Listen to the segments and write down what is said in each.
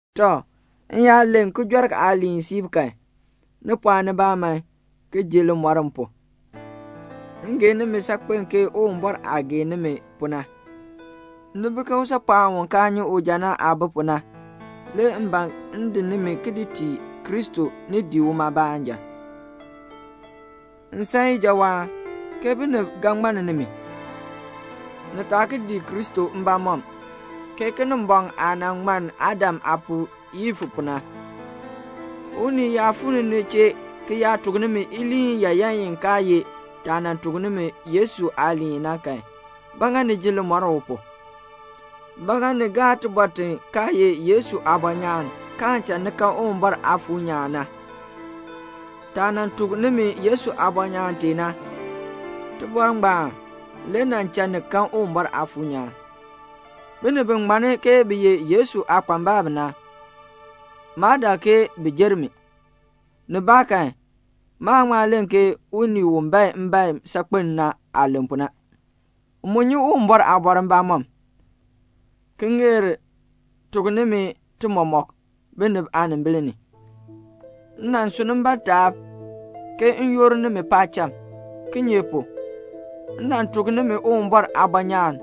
Tɔ, m yaa len kijɔrk aaliin siib kan, ni pɔɔn nibaa man ki ji limɔr m pu. M gee nimi saakpen ke Uwumbɔr aah gee nimi pu na. Ni bi ke usaapɔɔn u kaa nyi uja na aah bi pu na, le m ban m di nimi ki di tii Kristo ni dii uma baanja. M san ijawaan, ke binib ga ŋmann nimi, ni taa ki dii Kristo mbamɔm, ke Kinimbɔŋ aah nan ŋmann Adam aapuu Iif pu na. Unii yaa fuu ni ni chee ki yaa tuk nimi iliin yaayan i kaa ye taah nan tuk nimi Yesu aaliin na kan, ba ŋa ni ji limɔr u pu? Ba ŋa ni gaa tibɔr ti kaa ye Yesu aabɔnyaan, kaan cha ni kan Uwumbɔr Aafuur nyaan na? Taah nan tuk nimi Yesu aabɔnyaan tee na, tibɔr ngbaan le nan cha ni kan Uwumbɔr Aafuur nyaan. Binib bi ŋmanni ke bi ye Yesu aakpambalb na, maa dak ke bi jer mi. Nibaakan, maan ŋma len ke unii u bae mbaen saakpen na aah len pu na. M mu nyi Uwumbɔr aabɔr mbamɔm, ki ŋeer tuk nimi ti mɔmɔk, binib aanimbil ni. M nan sunn mbaa taab ke m yoor nimi paacham; kinye pu? m nan tuk nimi Uwumbɔr aabɔnyaan,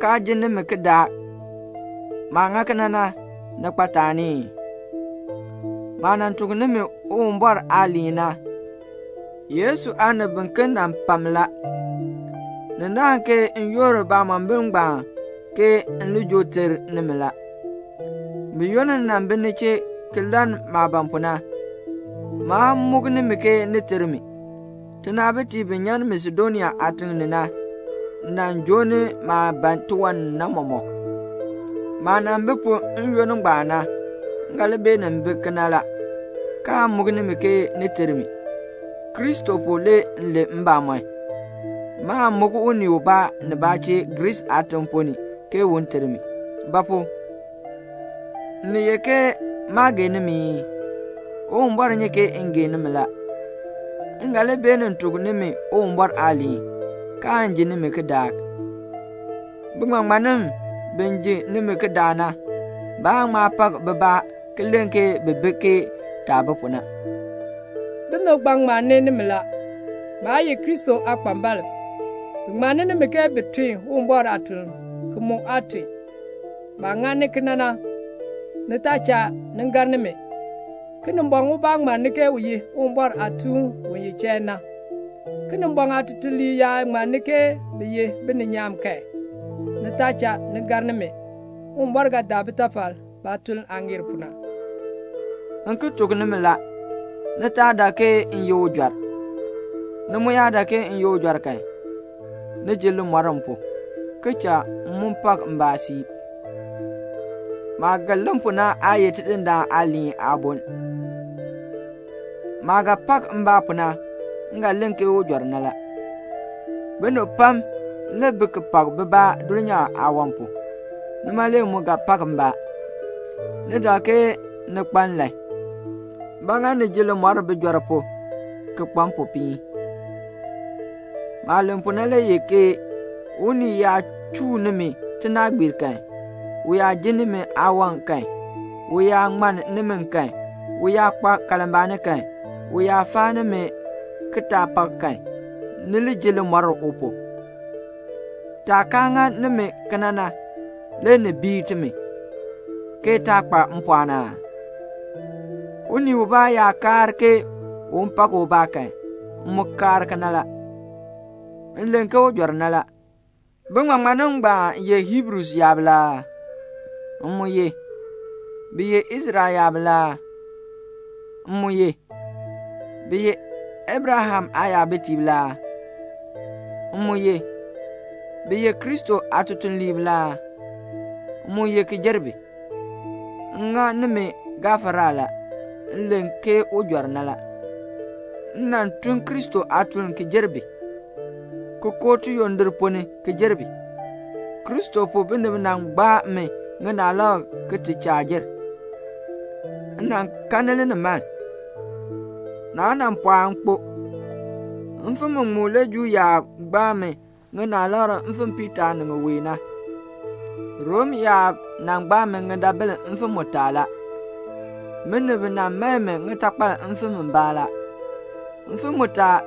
kaa jin nimi kidaak. Maah ŋa kena na, ni kpa taani ii? Maah nan tuk nimi Uwumbɔr aaliin na, Yesu aanib biken nan pa mi la. Ni naahn ke m yoor baamombil ngbaan ke m li joo ter nimi la. Buyoonn m nan bi ni chee ki lann maah ban pu na, maa muk nimi ke ni ter mi. Tinaabitiib bi nyan Masedonia aatiŋ ni na nan joo ni maah ban tiwan ni na mɔmɔk. Maah nan bi pu n-yoonn ngbaan na, m ga li beenin bi kena la, kaan muk nimi ke ni ter mi. Kristo pu le m len mbamɔn, maan muk unii ubaa nibaa chee Griis aatiŋ ponn ni ke un ter mi. Ba pu? Ni ye ke maa gee nimi ii? Uwumbɔr nyi ke m gee nimi la. M ga li beenin tuk nimi Uwumbɔr aaliin, kaan ji nimi kidaak. Biŋmaŋmannim bi ji nimi kidaak na, baan ŋma pak bibaa ki len ke bi bi ke taah bi pu na. Binib ngbaan ŋmanni nimi la. Baa ye Kristo aakpambalb. Bi ŋmanni nimi ke bi tun Uwumbɔr aatuln, ki mu aa tun. Baah ŋani kena na, ni taa cha ni gar nimi. Kinimbɔŋ ubaa ŋmanni ke u ye Uwumbɔr aatuun u ye chain na. Kinimbɔŋ aatutuliib yaa ŋmanni ke bi ye bininyaan kan, ni taa cha ni gar nimi. Uwumbɔr ga daa bitafal baatuln aah ŋeer pu na. M ki tuk nimi la, ni taa dak ke m ye ujɔr. Ni mu yaa dak ke m ye ujɔr kan, ni ji limɔr m pu, ki cha m mu pak mbaa siib. Maah ga len pu na aa ye Tidindaan aaliin aaboln. Maah ga pak mbaa pu na, m ga len ke ujɔr na la. Binib pam le bi ki pak bibaa dulnyaa aawan pu. Nima le m mu ga pak mbaa. Ni dak ke ni kpa nlan. Ba ŋa ni ji limɔr bijɔrb pu ki kpa mpopiin? Maah len pu na le ye, ke unii yaa chuu nimi tinaagbiir kan, u yaa ji nimi aawan kan, u yaa ŋmann nimi kan, u yaa kpa kalmbaani kan, u yaa faa nimi kitaapak kan, le ni ji limɔr u pu. Taah kaa ŋa nimi kena na, le ni bii timi, ke taa kpa mpɔɔn aa? Unii ubaa yaa kaar ke un pak ubaa kan, m mu kaar kena la. M len ke ujɔr na la. Biŋmaŋmannim ngbaan ye Hiibru yaab la aa? M mu ye. Bi ye Israel yaab la aa? M mu ye. Bi ye Abraham aayabitiib la aa? M mu ye. Bi ye Kristo aatutuliib la aa? M mu ye ki jer bi. M ŋa nimi gafara la, m len ke ujɔr na la. M nan tun Kristo aatuln ki jer bi, ki koo tiyondir ponn ni ki jer bi. Kristo pu binib nan gbaa mi ŋinaalab ki ti chaa jer. M nan kanni linimaln, naa nan pɔɔ m kpo. Mfim muŋmu le Juu yaab gbaa mi ŋinaalab mfim piitaa ni muwae na. Rom yaab nan gbaa mi ŋidabil mfim mutaa la. Binib nan mae mi ŋitakpal mfim mbaa la. Mfim mutaa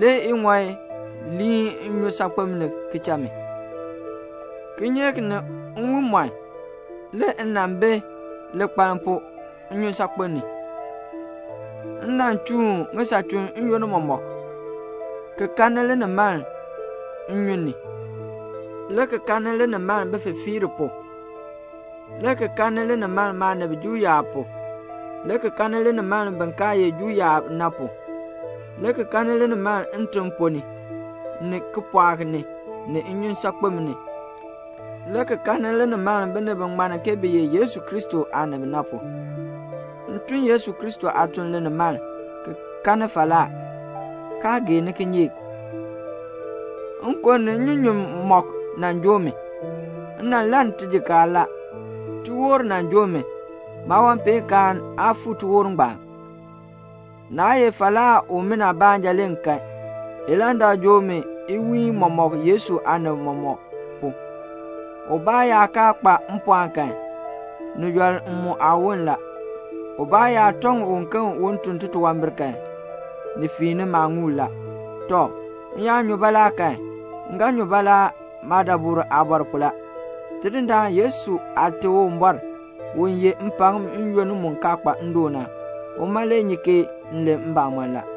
le iŋɔi liin nnyusaakpem ni ki cha mi. Kinyeek ni nwiimɔn le m nan bi likpaln pu nnyusaakpem ni. M nan chuun ŋisachun n-yoonn mɔmɔk, ki kanni linimaln nnyun ni, le ki kanni linimaln bififiirb pu, le ki kanni linimaln maanib Juu yaab pu, le ki kanni linimaln bin kaa ye Juu yaab na pu, le ki kanni linimaln ntim ponn ni, ni kipɔɔk ni, ni nnyusaakpem ni, le ki kanni linimaln binib bi ŋmann ke bi ye Yesu Kristo aanib na pu. M tun Yesu Kristo aatuln linimaln, ki kanni falaa, kaa geeni kinyeek. Nkon ni nnyunyun mɔk nan joo mi. M nan lann tijikaar la. Tiwoor nan joo mi. Maawanpeenkaan aa fuu tiwoor ngbaan. Naa ye falaa umina baanja le m kan. Ilandak joo mi iwiin mɔmɔk Yesu aanib mɔmɔk pu. Ubaa yaa kaa kpa mpɔɔn kan, ni yɔl m mu aawon la. Ubaa yaa tɔŋ uken un tun titunwambir kan, ni fiini maaŋuul la. Tɔ, m yaa nyu baalaa kan, m ga nyu baalaa maadabur aabɔr pu la. Tidindaan Yesu Aate Uwumbɔr, u yeh mpakm n-yoonn mu kaa kpa ndoon na, uma le nyi ke m len mbamɔn la.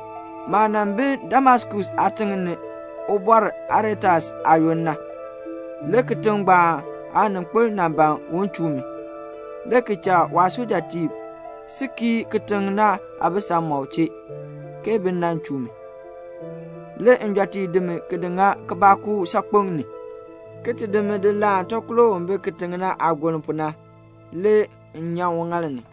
Maah nan bi Damaskus aatiŋ ni Ubɔr Aretas aayoonn na, le kitiŋ ngbaan aaninkpil nan ban un chuu mi, le ki cha waasujatiib si kii kitiŋ na aabisamɔb chee, ke bi nan chuu mi. Le njɔtiib di mi ki di ŋa kibɔɔkuuk saakpeŋ ni, ki ti di mi laan takolo u bi kitiŋ na aagoln pu na, le m nyan uŋaal ni.